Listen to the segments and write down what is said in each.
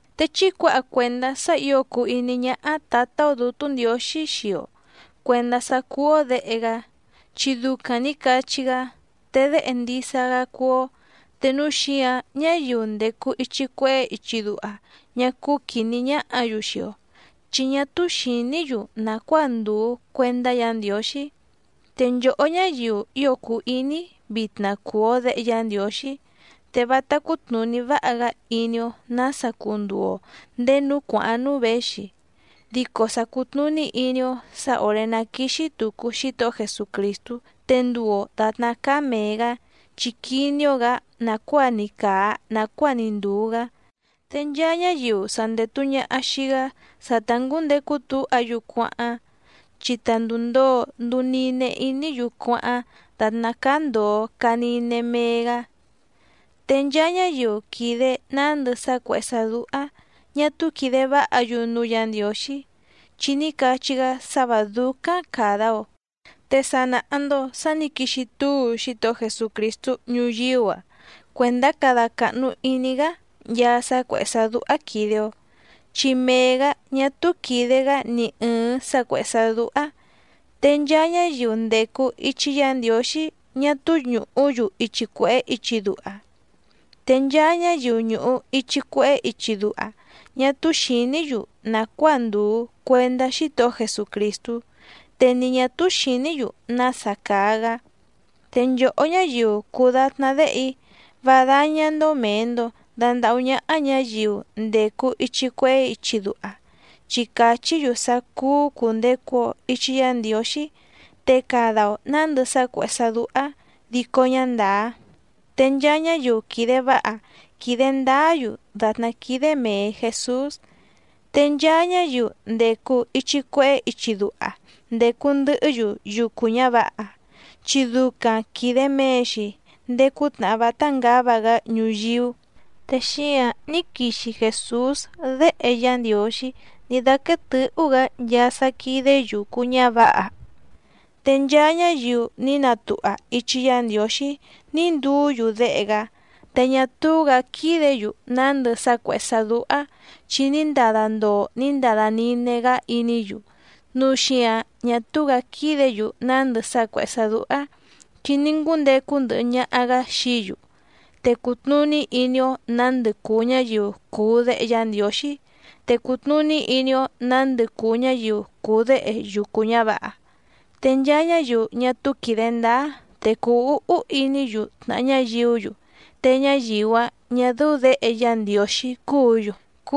Te chí cuǎha cuèndá sá ǐo cùu iní ñáhá Tǎtá‑ó Dǔtú Ndiǒxí xii‑o cuèndá sá cúú‑ó děhe‑gá, chi ducaⁿ nǐ cachí‑gá, te déhe ndisa‑gá cúú‑ó. Te núu xíǎⁿ ñáyiu ndècu ichi cuehé ichi duha ñá cúú quìní ñáhǎ‑yu xii‑o, chi ñá túú xìní‑yu nàcuáa ndùu cuendá Yǎ Ndiǒxí. Te nchòhó ñáyiu ío cùu iní‑í, vitna cùu‑o déhe Yá Ndiǒxí, te vátá cútnùní váha‑gá iní‑ó nǎsa cunduu‑o ndèé núú cuàháⁿ núú věxi. Dico sa cùtnuní iní‑ó sǎ òré ná quìxi tucu Xítohó Jesucrìstú te nduu‑o dàtná cáá mèe‑gá, chi quiní‑ó‑gǎ nàcuáa‑ni càa nacuáa‑ni ndùu‑gá. Te nchaa ñáyiu sa ndètu ñaha xii‑gá sa ta ngǔndecu túha‑yu cuáháⁿ, chi ta ndùu ndoo nduu nine iní‑yu cuáháⁿ dàtná cáá ndòo caa nine mee‑gá. Te nchaa ñáyiu quìde nándɨ sá cuèhé sá dúhá ñà túú quìde váha‑yu núú Yǎ Ndiǒxí, chi ní cachí‑gá sá vǎ dúcáⁿ càda‑o. Te sa nàha‑ndo sá nǐ quixi túu Xítohó Jesucrìstú ñuyíú‑a cuèndá cada càhnu iní‑gá nchaa sá cuèhé sá dúhá quìde‑o, chi mee‑gǎ ñá túú quìde‑gá ni ɨ̀ɨⁿ sá cuèhé sá dúhá. Te nchaa ñáyiu ndècu ichi Yá Ndiǒxí ñá túú ñùhú‑yu ichi cuèhé ichi duha. Te nchaa ñáyiu ñùhu ichi cuehé ichi duha ñá túú xìní‑yu nàcuáa ndùu cuendá Xítohó Jesucrìstú te ni ñǎ túú xìní‑yu nása càa‑gá. Te nchòhó ñáyiu cùu datná déhe‑í, vá dáñá‑ndó mèe‑ndo dandahú ñáhá ñǎyiu ndècu ichi cuehé ichi duha, chi càchí‑yu sá cúú cùndecu‑o ichi Yá Ndiǒxí te cada‑o nǎndɨ sá cuèhé sá dúhá dico ñá ndàá. Te nchaa ñáyiu quìde váha quìde ndáá‑yu dàtná quídé mèe Jesús. Te nchaa ñáyiu ndècu ichi cuehé ichi duha ndècu ndɨhɨ́‑yu yucu ñǎvǎha, chi ducaⁿ quìde mee‑xi ndéé cútnàhá vátá ngǎva‑gá ñuyíú. Te xíǎⁿ ní quixi Jèsús Déhe Yá Ndiǒxí ní dáquéé tɨ̌hú‑gǎ nchaa sá quídé yùcu ñávǎha. Te nchaa ñáyiu ní natuha ichi Yá Ndiǒxí ní nduú‑yu déhe‑gá, te ñá túú‑gǎ quídě‑yu nándɨ sá cuèhé sá dúhá chi ní ndada ndoo ní ndada nine‑gá iní‑yu. Núu xíǎⁿ ñá túú‑gǎ quídě‑yu nándɨ sá cuèhé sá dúhá, chi ní ngúndecu ndɨhɨ ñaha‑gǎ xií‑yu. Te cùtnuní iní‑ó nǎndɨ cùu ñáyiu cùu déhe Yá Ndiǒxí, te cùtnuní iní‑ó nǎndɨ cùu ñáyiu cùu déhe yucu ñǎvǎha. Te nchaa ñáyiu ñá túú quìde ndáá, te cùu úhú iní‑yu tnàha ñáyiú‑yu, te ñáyiu‑áⁿ ñà dɨ́ú děhe Yá Ndiǒxí cúǔ‑yu.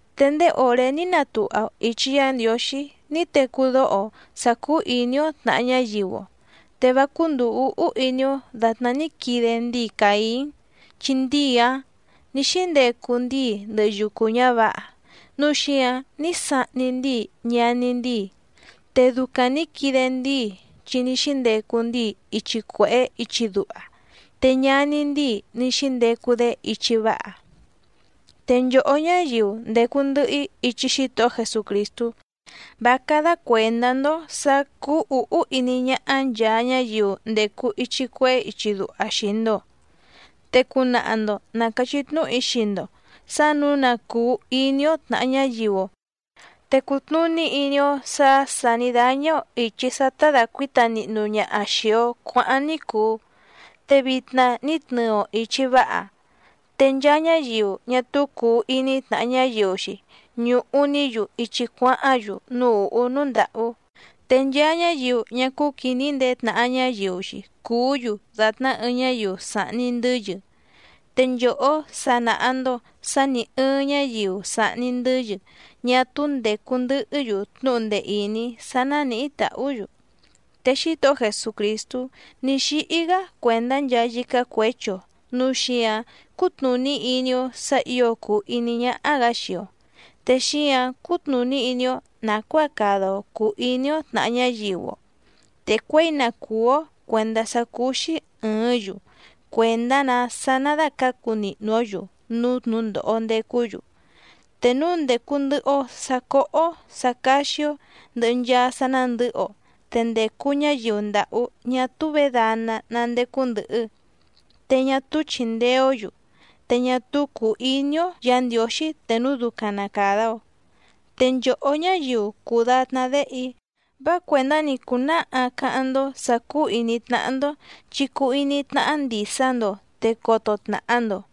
Te ndéé òré ní natuha‑o ìchi Yá Ndiǒxí ní tecú dóho‑o sǎ cúú ìní‑ó tnàha ñáyiu‑o. Te vá cúndùu úhú iní‑ó dàtná ní quide ndíi Càín, chi ndíi‑áⁿ nǐ xíndecu ndíi ndɨhɨ yucu ñǎvǎha núu xíǎⁿ ní sahni ndíi ñaní ndíi. Te ducaⁿ nǐ quide ndíi chi ní xíndecu ndíi ichi cuèhé ichi duha, te ñaní ndíi ní xíndecu‑dé ichi váha. Te nchòhó ñáyiu ndècu ndɨhɨ‑í ichi Xítohó Jesucrìstú, vá cádá cuèndá‑ndó sǎ cúú ǔhú iní ñáhá nchàa ñáyiu ndècu ichi cuehé ichi duha xii‑ndo. Te cunaha‑ndo na càchí tnúhu‑í xii‑ndo sǎ nǔu na cùu iní‑ó tnàha ñáyiu‑o, te cùtnuní iní‑ó sǎ sà ní dáñá‑ó ìchi sá tá dàcuíta nihnu ñaha xìi‑o cuáháⁿ ní cùu, te vitna ní tnɨɨ‑o ìchi váha. Te nchaa ñáyiu ñá túú cùu iní tnàha ñáyiu‑xi ñùhu‑ní‑yu ichi cuáháⁿ‑yu núú ùhú núú ndàhú. Te nchaa ñáyiu ñá cúú quìní ndeé tnàha ñáyiu‑xi cùú‑yu dàtná ɨɨⁿ ñáyiu sàhni ndɨ́yɨ. Te nchòhó sa nàha‑ndo sá nì ɨɨⁿ ñáyiu sàhni ndɨ́yɨ ñá túú ndècu ndɨhɨ́‑yu tnúhu ndee ìní sá nánìhí tàhú‑yu. Te Xítohó Jesucrìstú ní xíhí‑gá cuèndá nchaa yícá cuěchi‑o, núu xíǎⁿ cútnùní iní‑ó sǎ ǐo cùu iní ñáhá‑gǎ xii‑o. Te xíǎⁿ cútnùní iní‑ó nàcuáa cada‑o cùu iní‑ó tnàha ñáyiu‑o, te cuěi na cùú‑ó cuèndá sá cúú‑xí ɨ̀ɨ́ⁿ‑yu, cuèndá‑nǎ sá ná dàcácu nihnu‑ǒ‑yu núú tnǔndòho ndecú‑yu. Te núu ndècu ndɨhɨ‑o sá cóhó sǎ cáxí‑ó ndɨ̀hɨ nchaa sá nándɨ̌hɨ‑o, te ndècu ñáyiu ndàhú ñá túú vědana ná ndécú ndɨ̀hɨ, te ñá túú chìndee‑ó‑yu, te ñá túú cùu iní‑ó Yǎ Ndiǒxí te núu ducaⁿ na càda‑o. Te nchòhó ñáyiu cùu datná déhe‑í vá cuèndá‑ni cùnáha cáháⁿ‑ndó sǎ cúú ìní tnáhá‑ndó, chi cuu iní tnáhá ndìsa‑ndo te coto tnàha‑ndo.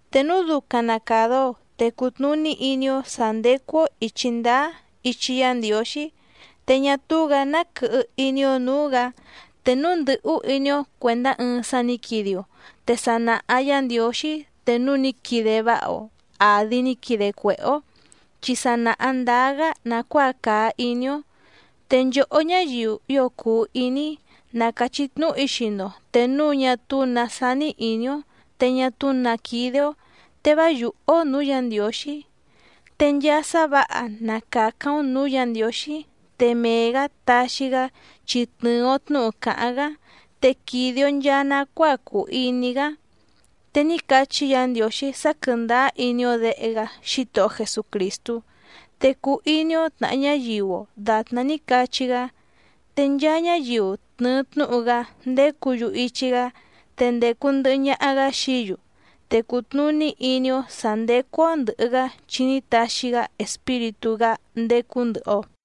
Te núu ducaⁿ na càda‑o, te cutnùní iní‑ó sǎ ndécú‑ó ìchi ndáá ichi Yá Ndiǒxí, te ñá túú‑gǎ ná quɨhɨ iní‑ó nǔú‑gǎ. Te núu ndɨ̀hú iní‑ó cuèndá ɨɨⁿ sá nǐ quide‑o, te sa nàha Yá Ndiǒxí te núu ní quide váha‑o àdi ní quide cuèhé‑ó, chi sa nàha ndáá‑gá nàcuáa càa iní‑ó. Te nchòhó ñáyiu ío cùu iní‑í, na càchí tnúhu‑í xii‑ndo, te núu ñá túú nǎ sání ìní‑ó te ñá túú nǎ quídé‑ó, te vá yùhú‑ó nǔú Yǎ Ndiǒxí. Te nchaa sá vǎha na càcáⁿ‑ó nǔú Yǎ Ndiǒxí, te mee‑gǎ taxi‑gá chi tnɨ̀ɨ‑o tnúhu càháⁿ‑gá, te quìde‑o nchaa nacuáa cùu iní‑gá. Te ní cachí Yǎ Ndiǒxí sá quɨ̀ndáá iní‑ó Děhe‑gá Xítohó Jesucrìstú, te cuu iní‑ó tnàha ñáyiu‑o dàtná ní cachí‑gá. Te nchaa ñáyiu tnɨ̀ɨ tnúhu‑gá ndécǔ‑yu ichi‑gá, te ndècu ndɨhɨ ñaha‑gá xií‑yu. Te cùtnuní iní‑ó sǎ ndécú‑ó ndɨ̀hɨ‑gá chi ní taxi‑gá Espíritú‑gá ndécú ndɨ̀hɨ‑o.